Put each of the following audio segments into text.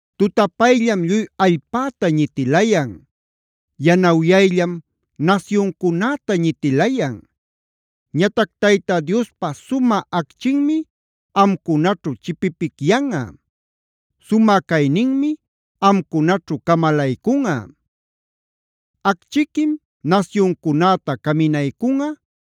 Tutapayllam lluy allpäta ñitilayan; yanawyayllam nasyuncunäta ñitilayan. Ñatac Tayta Diospa sumä acchinmi amcunaćhu chipipicyanꞌa; sumä cayninmi amcunaćhu camalaycunꞌa. Acchiquim nasyuncunäta caminaycunꞌa.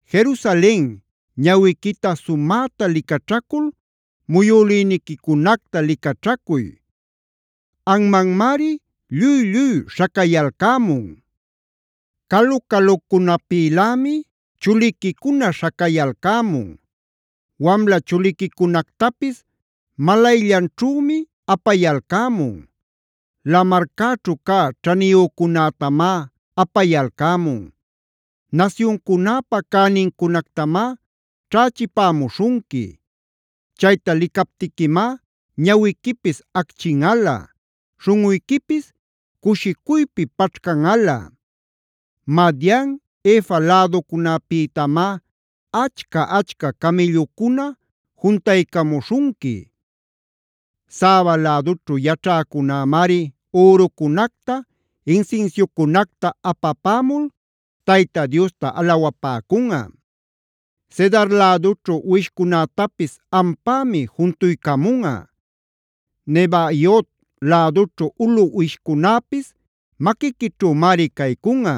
“Jerusalen, ñawiquita sumäta licaćhacul muyülïniquicunacta licaćhacuy. Anmanmari lluy-lluy śhacayalcämun. Calu-calucunapïlämi chuliquicuna śhacayalcämun. Wamla chuliquicunactapis malayllanćhümi apayalcämun. Lamarcäćhu cä ćhaniyücunätamá apayalcämun; nasyuncunäpa cänincunactamá ćhächipämuśhunqui. Chayta licaptiquimá ñawiquipis acchinꞌalä; śhunꞌuyquipis cushicuypi paćhcanꞌalä. Madian, Efa läducunapïtamá achca-achca camïllucuna juntaycamuśhunqui; Saba lädućhu yaćhäcunämari ürucunacta, insinsiucunacta apapämul Tayta Diosta alawapäcunꞌa. Cedar lädućhu uwishcunätapis ampämi juntuycamunꞌa. Nebaiot lädućhu ulu uwishcunäpis maquiquićhümari caycunꞌa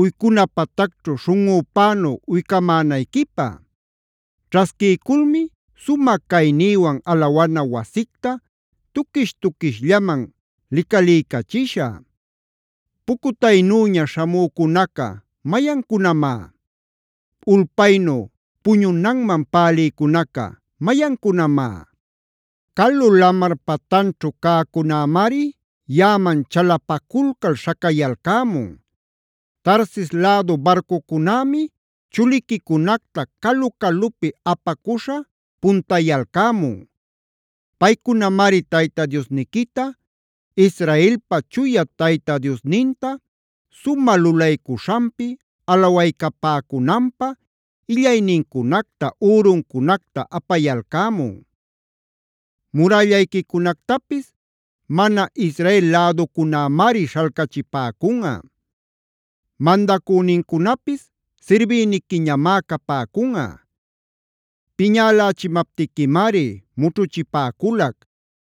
uycuna patacćhu śhunꞌüpänu uycamänayquipä. Ćhasquiyculmi sumä caynïwan alawana wasicta tuquish-tuquishllaman licaliycachishä. “¿Pucutaynüña śhamücunaca mayancunamá? ¿Ulpaynu puñunanman pälïcunaca mayancunamá? Calu lamar patanćhu cäcunämari yaꞌaman chalapaculcal śhacayalcämun. Tarsis lädu barcucunämi chuliquicunacta calu-calupi apacuśha puntayalcämun. Paycunamari Tayta Diosniquita, Israelpa Chuya Tayta Diosninta sumä lulaycuśhanpi alawaycapäcunanpä illaynincunacta, üruncunacta apayalcämun. “Murällayquicunactapis mana Israel läducunämari śhalcachipäcunꞌa; mandacünincunapis sirbïniquiñamá capäcunꞌa. Piñälächimaptiquimari mućhuchipäculac;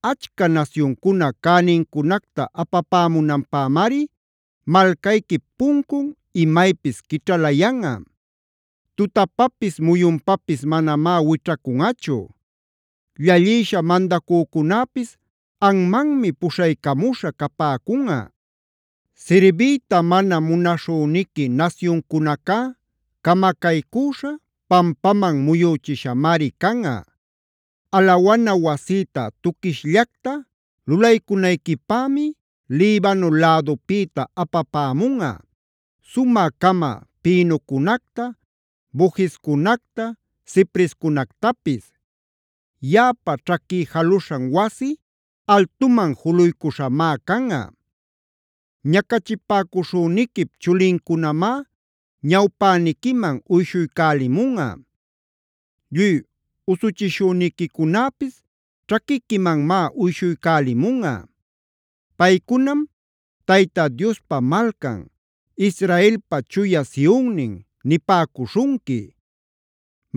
Achca nasyuncuna cänincunacta apapämunanpämari malcayquip puncun imaypis quićhalayanꞌa;c tutapapis muyunpapis manamá wićhacunꞌachu. Llallïsha mandacücunäpis anmanmi puśhaycamuśha capäcunꞌa. Sirbiyta mana munaśhüniqui nasyuncunacá camacaycüśha, pampaman muyüchishamari canꞌa. “Alawana wasïta tuquishllacta lulaycunayquipämi Libano lädupïta apapämunꞌa: sumä-cama pinocunacta, bojescunacta, ciprescunactapis. Yaꞌapa ćhaquí jaluśhan wasi, altuman juluycuśhamá canꞌa. Ñacachipäcuśhüniquip chulincunamá ñawpäniquiman uyshuycälimunꞌa. Lluy usuchishüniquicunäpis ćhaquiquimanmá uyshuycälimunꞌa.d Paycunam: ‘Tayta Diospa malcan, Israelpa Chuya Sionnin’ nipäcuśhunqui.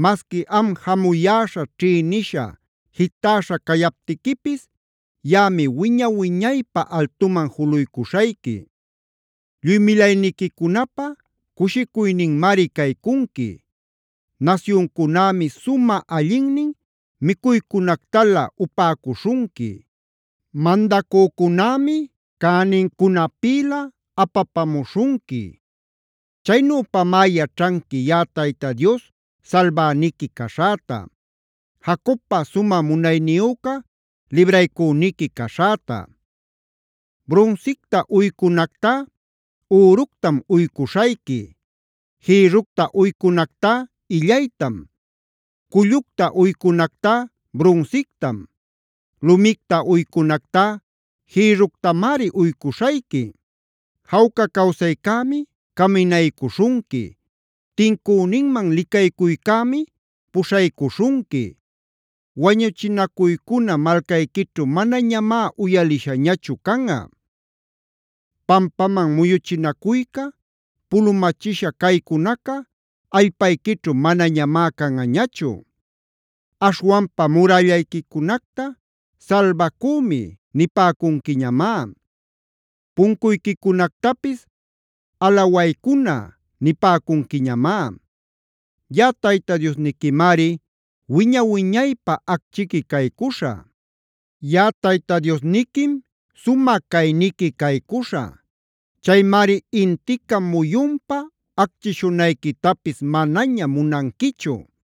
“Masqui am jamuyäśha, ćhïnisha, jitäśha cayaptiquipis yaꞌami wiña-wiñaypä altuman juluycuśhayqui; lluy milayniquicunapä cushicuyninmari caycunqui. Nasyuncunämi sumä allinnin micuycunactalä upäcuśhunqui; mandacücunämi cänincunapïlä apapamuśhunqui. Chaynüpamá yaćhanqui yaꞌa Tayta Dios salbäniqui caśhäta; Jacobpa sumä munayniyüca libraycüniqui caśhäta. “Brunsicta uycunactá üructam uycuśhayqui; Jïrructa uycunactá illaytam, cullucta uycunactá brunsictam; lumicta uycunactá jïrructamari uycuśhayqui. Jawca cawsaycämi caminaycuśhunqui; tincüninman licaycuycämi puśhaycuśhunqui. Wañuchinacuycuna malcayquićhu manañamá uyalishañachu canꞌa. Pampaman muyuchinacuyca, pulumachisha caycunaca allpayquićhu manañamá canꞌañachu. Aśhwanpa murällayquicunacta ‘Salbacümi’ nipäcunquiñamá; puncuyquicunactapis ‘Alawaycuna’ nipäcunquiñamá. “Yaꞌa Tayta Diosniquimari wiña-wiñaypä acchiqui caycuśhä; Yaꞌa Tayta Diosniquim sumä cayniqui caycuśhä. Chaymari intica muyunpa acchishunayquitapis manaña munanquichu;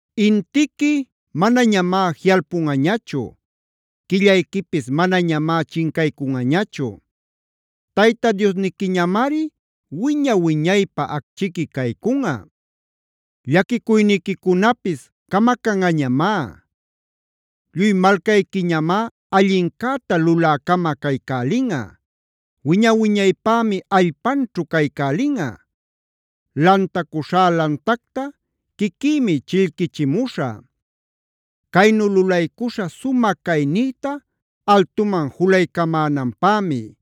Intiqui manañamá jiꞌalpunꞌañachu; quillayquipis manañamá chincaycunꞌañachu. Tayta Diosniquiñamari wiña-wiñaypä acchiqui caycunꞌa; llaquicuyniquicunapis camacanꞌañamá. “Lluy malcayquiñamá allincäta lulä-cama caycälinꞌa; wiña-wiñaypämi allpanćhu caycälinꞌa. Lantacuśhá lantacta quiquïmi chillquichimuśhä; caynu lulaycuśha sumä caynïta altuman julaycamänanpämi.